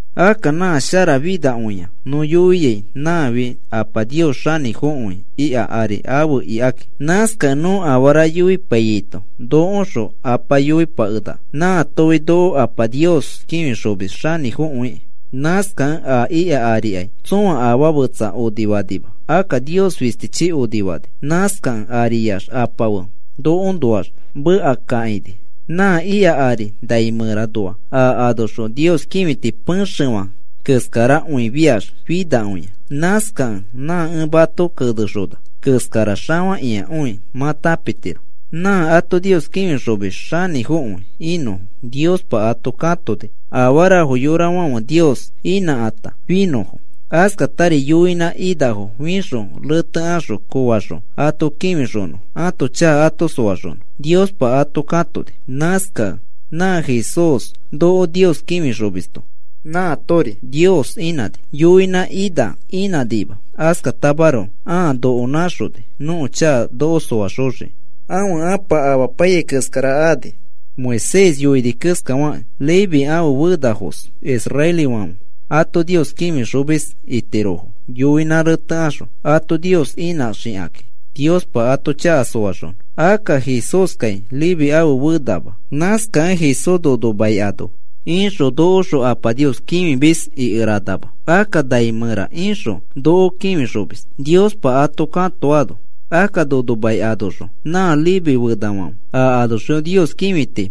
Akka nã sharafinakõia nõ yoiai nãfi Apa Nios xanĩfokõi ika ari afe ikaki. Nãskakẽ nõ afara yoipaiyaito nokoõxõ Apa yoipakenaka. Nãatofi noko Apa Nios kĩfixomis xanĩfokõikĩ. Nãskakẽ a ika arikai tsõa afaa fetsa onifanima. Akka Nios fistichi onifani. Nãskakẽ ariax Apa fe nokoõnoax mekakakãini. Nã ika ari nai mẽra anoa a anoxõ Nios kĩfiti pexefã keskarakõifiax finakõia. Nãskakẽ nã ẽ mato kenexona keskara xafakĩakõi mã tãpitiro. Nã ato Nios kĩfixomis xanĩfokõi inõfo Niospa ato katoni afarafo yorafãfe Nios inãkata finõfo. Askatari yoinã inafo fixõ retekaxõ koofaxõ ato kĩfixonõfo ãto chaka ato soaxonõ Niospa ato katoni. Nãskakẽ nã Jesús, noko Nios kĩfixomisto, nãatori Nios inãni. Yoinã ina inãnima. Askatamaroko ãa noko nãxoni nõko chaka noko soaxoxiki. Ãfe Ãpa amapaiyai keskara ani. Moisés yoini keskafakĩ Leví ãfe fenafos israelifãfe ato Nios kĩfixomis itirofo yoinã retekaxõ ato Nios inãxoxikakĩ Niospa ato chaka soaxonõ. Akka Jesúskai Leví ãfe fenama. Nãskakẽ Jesús nono mai ano ixõ nokoõxõ Apa Nios kĩfimis ikeranama. Akka nai mẽra ixõ noko kĩfixomis, Niospa ato katoano. Akka nono mai anoxõ nã Leví fenafãfe a anoxõ Nios kĩfiti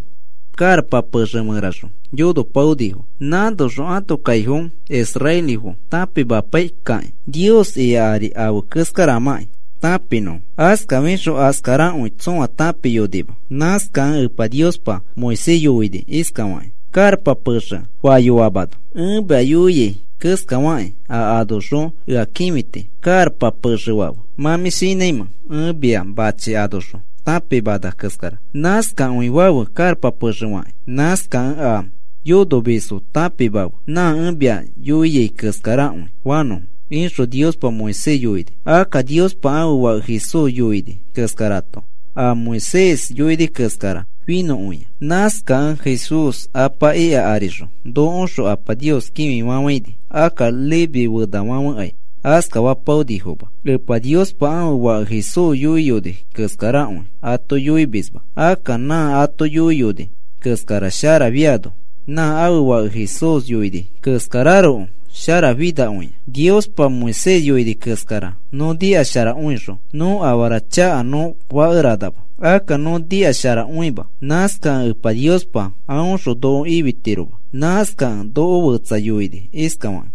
karapa pexe mẽraxõ yonopaonifo. Nãnoxõ ãto kaifo israelifo tãpimapaikakĩ Nios ika ari afe keskaramãkĩ tãpinõfo. Askafixõ askarakõi tsõa tãpiyonima. Nãskakẽ Epa Niospa Moisés yoini iskafakĩ karapa pexe fayoamano: “Ẽ mia yoiai keskafakĩ a anoxõ ea kĩfiti karapa pexe fafe. ¿Mã mĩ shinãimẽ ẽ mia machi anoxõ tãpimana keskara nãskakõi fafe karapa pexe fakĩ? Nãskakẽ a yonomisfo tãpimafe nã ẽ mia yoiai keskarakõi fanõfo,” ixõ Epa Niospa Moisés yoini. Akka Niospa ãfe Fake Jesús yoini keskarato a Moisés yoini keskara finõkõia. Nãskakẽ Jesús Apa ika arixõ nokoõxõ Apa Nios kĩfifafãini. Akka Leví fenafãfekai askafapaonifoma. Epa Niospa ãfe Fake Jesús yoiyoni keskarakõi ato yoimisma. Akka nã ato yoiyoni keskara sharafiano nã ãfe Fake Jesús yoini keskararoko sharafinakõia. Niospa Moisés yoini keskara nõ nikasharakõixõ nõ afara chaka nõ fakeranama. Akka nõ nikasharakõima. Nãskakẽ Epa Niospa aõxõ noko ifitiroma. Nãskakẽ noko fetsa yoini iskafakĩ: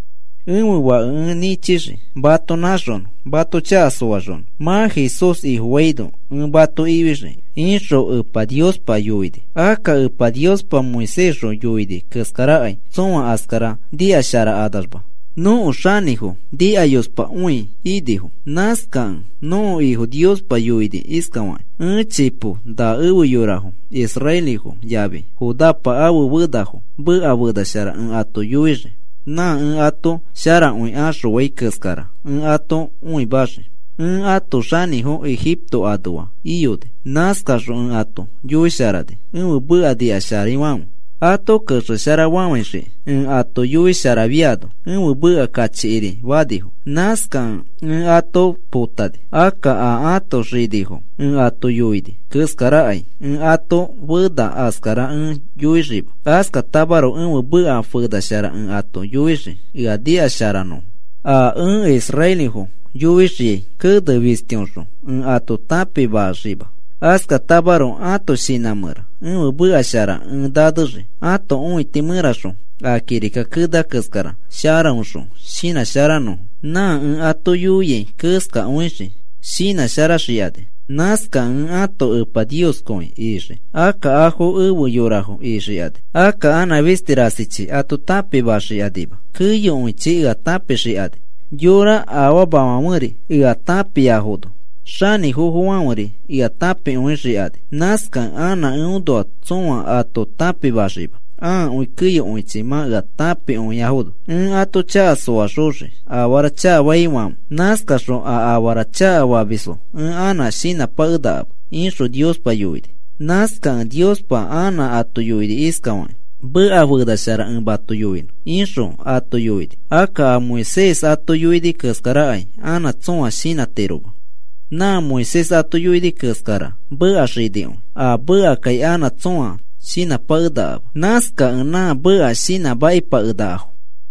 “Ẽfe Fake ẽ nĩchixii mato nãxonõ mato chaka soaxonõ. Mã Jesús Ifofaino ẽ mato ifixii,” ixõ Epa Niospa yoini. Akka Epa Niospa Moisésxõ yoini keskarakai tsõa askara nikasharakanamax nõko xinifo nikayospakõi inifo. Nãskakẽ nõko Ifo Niospa yoini iskafakĩ: Ẽ chipo na efe yorafo israelifo yafi Judapa ãfe fenafo meka fena shara ẽ ato yoixii. Nã ẽ ato sharakõi axõai keskara ẽ ato õimaxii. Ẽ ãto xinifo Egipto anoa iyoni. Nãskaxõ ẽ ato yoisharani ẽfe meka nikasharaifãfe ato kexesharafafãixikĩ. Ẽ ato yoisharafiaino ẽfe meka kachikiri fanifo. Nãskakẽ ẽ ato potani. Akka a ãto xinifo ẽ ato yoini keskarakai ẽ ãto fenafo askara ẽ yoixiima. Askatamaroko ẽfe meka fena shara ẽ ato yoixii ea nikasharanõfo. A ẽ israelifo yoixiai kene fistiõxõ ẽ ato tãpimaxima. Askatamaroko ãto shinã mẽra ẽfe meka shara ẽ nanexii ãto õiti mẽraxõ a kirika kenea keskara sharaõxõ shinãsharanõfo. Nã ẽ ato yoiai keskakõixii shinãsharaxikani. Nãskakẽ ẽ ãto Epa Nioskõi ixii. Akka afo efe yorafo ixikani. Akka anã fisti rasichi ato tãpimaxikanima. Keyokõichi ea tãpixikani. Yorafo afamafãferi ea tãpiaifono, xanĩfofofãferi ea tãpikõixikani. Nãskakẽ anã eõnoa tsõa ato tãpimaxima akõi keyokõichi mã ea tãpikõiafono. Ẽ ato chaka soaxoxii afara chakafafiaifãfe. Nãskaxõ a afara chakafamisfo ẽ anã shinãpakenakama, ixõ Niospa yoini. Nãskakẽ Niospa anã ato yoini iskafakĩ: “Meka fena shara ẽ mato yoinõ,” ixõ ato yoini. Akka a Moisés ato yoini keskarakai anã tsõa shinãtiroma. Nã Moisés ato yoini keskara meka xinikõi. A mekakai anã tsõa shinãpakenakama. Nãskakẽ nã meka shinãmakipakenakafo.